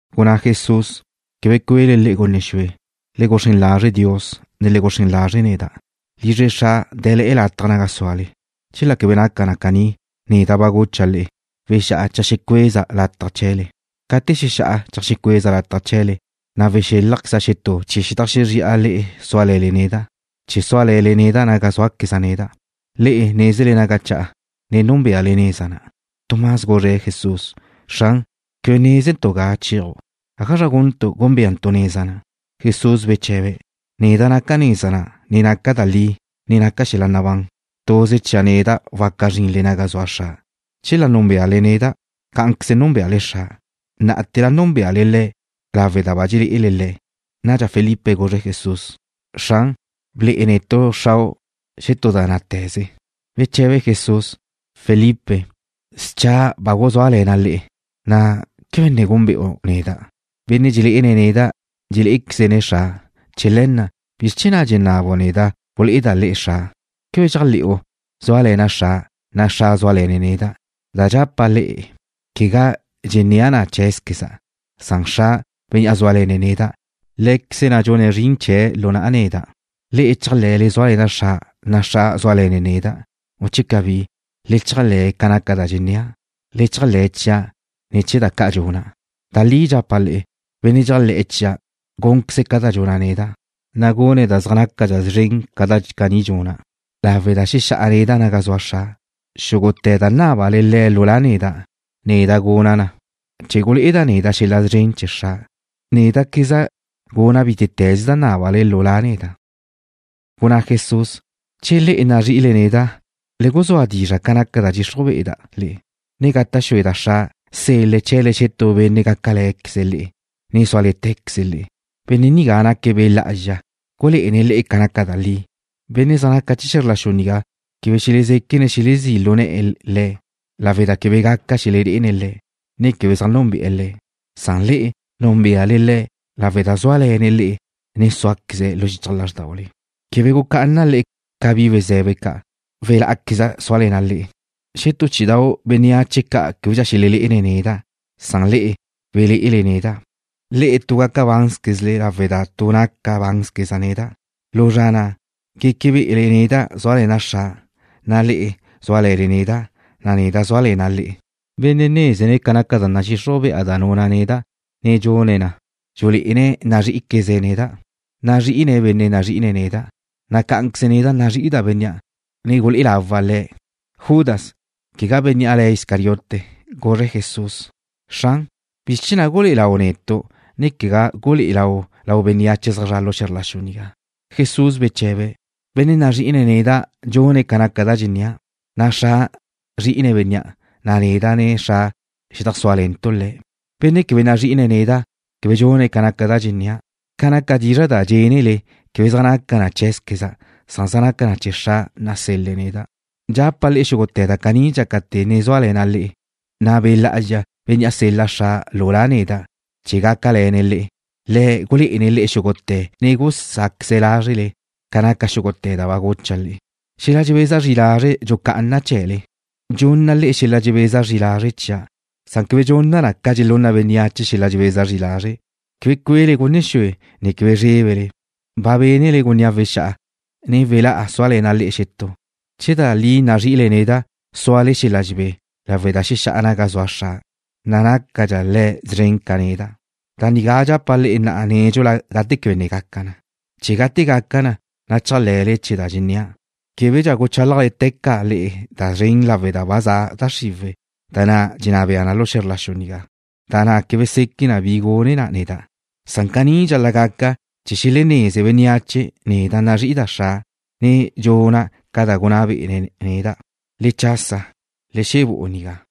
Gunná Jesús: ―Quebe cuele le'e gunne xue. Le guxrén lazre' Dios, ne le guxrén lazre' neda'. Lizre Xra' dé̱le̱'e̱ lataj naga súale. Chela quebe naca na caní, neda' ba gucha' le'e. Wexá'a cheajxecueza' lataj chee̱le. Ca te xexá'a cheajxecueza' lataj chee̱le, na' wexelájqueza' xetú chee̱ xedajxezri'a le'e súale̱le neda', chee̱ súale le'e naga súaqueza' neda'. Le'e nézele naga cha'a, ne núnbeale neza na'. Tomás guzre̱' Jesús: ―Xran, quebe nézentu' ga chéaju'. ¿Ájazra guntu' gúnbeantu' neza na'? Jesús beche̱be̱': ―Neda' naca' neza na', ne naca' da li, ne naca' xel-la' nabán. Tuze ne̱ chia' neda' waca zrinle naga zua Xra'. Chela núnbeale neda', cá'anqueze núnbeale Xra'. Ná'ate̱la núnbeale Le̱' lawe' da ba dxelé'ele Le̱'. Nadxa Felipe guzre̱' Jesús: ―Xran, ble'e netu' Xrau', xetú da ná'te̱ze. Beche̱be Jesús: ―Felipe, scha' ba guzúale̱na' le'e, na' ¿quebe ne gúnbe'u neda'? Benne' dxelé'ene̱' neda', dxelé'equezene̱' Xra'. Chee̱ le̱ na', ¿bizr chee̱ na' dxenabu' neda' gulé'eda' le'e Xra'? ¿Quebe dxéajle̱'u zúale̱na' Xra', na' Xra' zúale̱ne̱' neda'? Da dxapa' le'e, quegá dxennéa' na cheé̱zqueza'. Xra', Bénnea' zúale̱ne̱' neda', Lé̱queze̱' na' dxune̱' zrin chee̱' lu na'a neda'. Le chéajle̱le zúale̱na' Xra', na' Xra' zúale̱ne̱' neda', u che cabí dxéajle̱le ca da dxennéa', le chéajle̱ chia' ne̱ chee̱ da ca' dxuna'. Da li dxapa' le'e, benne' dxéajle̱'e̱ chia', gúnqueze̱' ca da dxuna' neda', na' gune̱' da zaj nácadxa zren ca da caní dxuna' lawe' da xexá'a neda' naga zua Xra'. Xúgute̱ da nábale le'e lu La' neda', neda' guna' na, chee̱ gulé'eda' neda' xel-la' szren chee̱ Xra'. Néda'queza' guna' bítete̱ze da nábale lu La' neda'. Gunná Jesús: ―Che le'e nazrí'ile neda', le guzúa dizra' ca naca da dxixruj be'eda' le'e. Neda' gata' xueda' Xra' sel-le̱' chee̱le xetú Benne' gácale̱queze̱' le'e, ne súale̱tecaze̱' le'e. Benne' nigá naque̱' Be' Lá'azxa gulé'ene̱' le'e ca naca da li. Benne' zaj naca chee̱ xe̱zr la xu nigá quebe xelezéquene̱' xelezí' lu ne̱'e̱ Le̱' lawe' da quebe gaca xelelé'ene̱' Le̱', ne quebe zaj núnbe'e̱ Le̱'. Le'e núnbeale Le̱' lawe' da zúale̱ne̱' le'e, ne súaqueze̱' lu xichaj lázrdaule. Quebe gucá'ana' le'e ca bi we̱ze̱be ca'. Welá'queza' súale̱na' le'e. Xetú chí'idau' bénneache ca' québedxa xelelé'ene̱' neda', san le'e welé'ele neda'. Le'e tu gaca bánzquezle lawe' da tu naca bánzqueza' neda'. Lu zra na' guéquebe'ele neda' zúale̱na' Xra', na' le'e zúale̱le neda', na' neda' zúale̱na' le'e. Benne' nézene̱' ca naca da nadxixruj bea na nuna' neda', ne dxune̱' na, dxulé'ene̱' nazrí'iqueze̱' neda'. Xra' zrí'ine̱' benne' nazrí'ine̱' neda', na' cá'anqueze neda' zri'ida' bénnea', ne gulé'e lawa' le̱'. Judas, quegá bénnea' le̱' Iscariote, guzre̱' Jesús: ―Xran, ¿bizr chee̱ na' gulé'e lau' netu', ne quegá gulé'e lau' lau bénneache zaj zre̱'e̱ xe̱zr la xu nigá? Jesús beche̱be̱': ―Benne' nazrí'ine̱' neda' dxune̱' ca naca da dxennéa', na' Xra' zrí'ine̱' bénnea', na' neda' ne Xra' xedajsúale̱ntu' le̱'. Benne' quebe nazrí'ine̱' neda' quebe dxune̱' ca da dxennéa'. Ca naca dizra' da dxénele quebe zaj naca na cheé̱zqueza'. Zaj naca na chee̱ Xra' nasel-le̱' neda'. ’Dxapa' le'e xúgute̱ da caní dxácate̱ ne zúale̱na' le'e, na' Be' Lá'azxa, Bénnea' sel-la Xra' lu La' neda' chee̱ gácale̱ne̱' le'e, Le̱' gulé'ene̱' le'e xúgute̱, ne gusá'queze̱' lázrele ca naca xúgute̱ da ba gucha' le'e. ’Xel-la' dxebeza zri lazre' dxuca'ana' chee̱le. Dxunna' le'e xel-la' dxebeza zri lazre' chia'. Quebe dxunna' na ca dxelunna bénneache xel-la' dxebeza zri lazre'. Quebe cuele gunne xue, ne quebe zrébele. Ba bénele gunnéa' wexá'a, ne welá'a súale̱na' le'e xetú. Chela da li nazrí'ile neda', suale xel-la' dxebé, lawe' da xexá'a naga zua Xra', na' nácadxa Le̱' szren ca neda'. Da nigá dxapa' le'e na'a nédxula gate quebe ne gaca na, chee̱ gate gaca na, na' chéajle̱le chee̱ da dxennéa'. ’Québedxa guchálajle̱teca' le'e da zren lawe' da ba za' da xriwe̱', da na' dxenná bea na lu xe̱zr la xu nigá. Da na' quebe seque na bi gune na neda'. Caní dxal-la' gaca chee̱ xeleneze bénneache neda' nazrí'ida' Xra', ne dxuna' ca da gunná bé'ene̱' neda'. ¡Le chasa! ¡Le xebú'u nigá!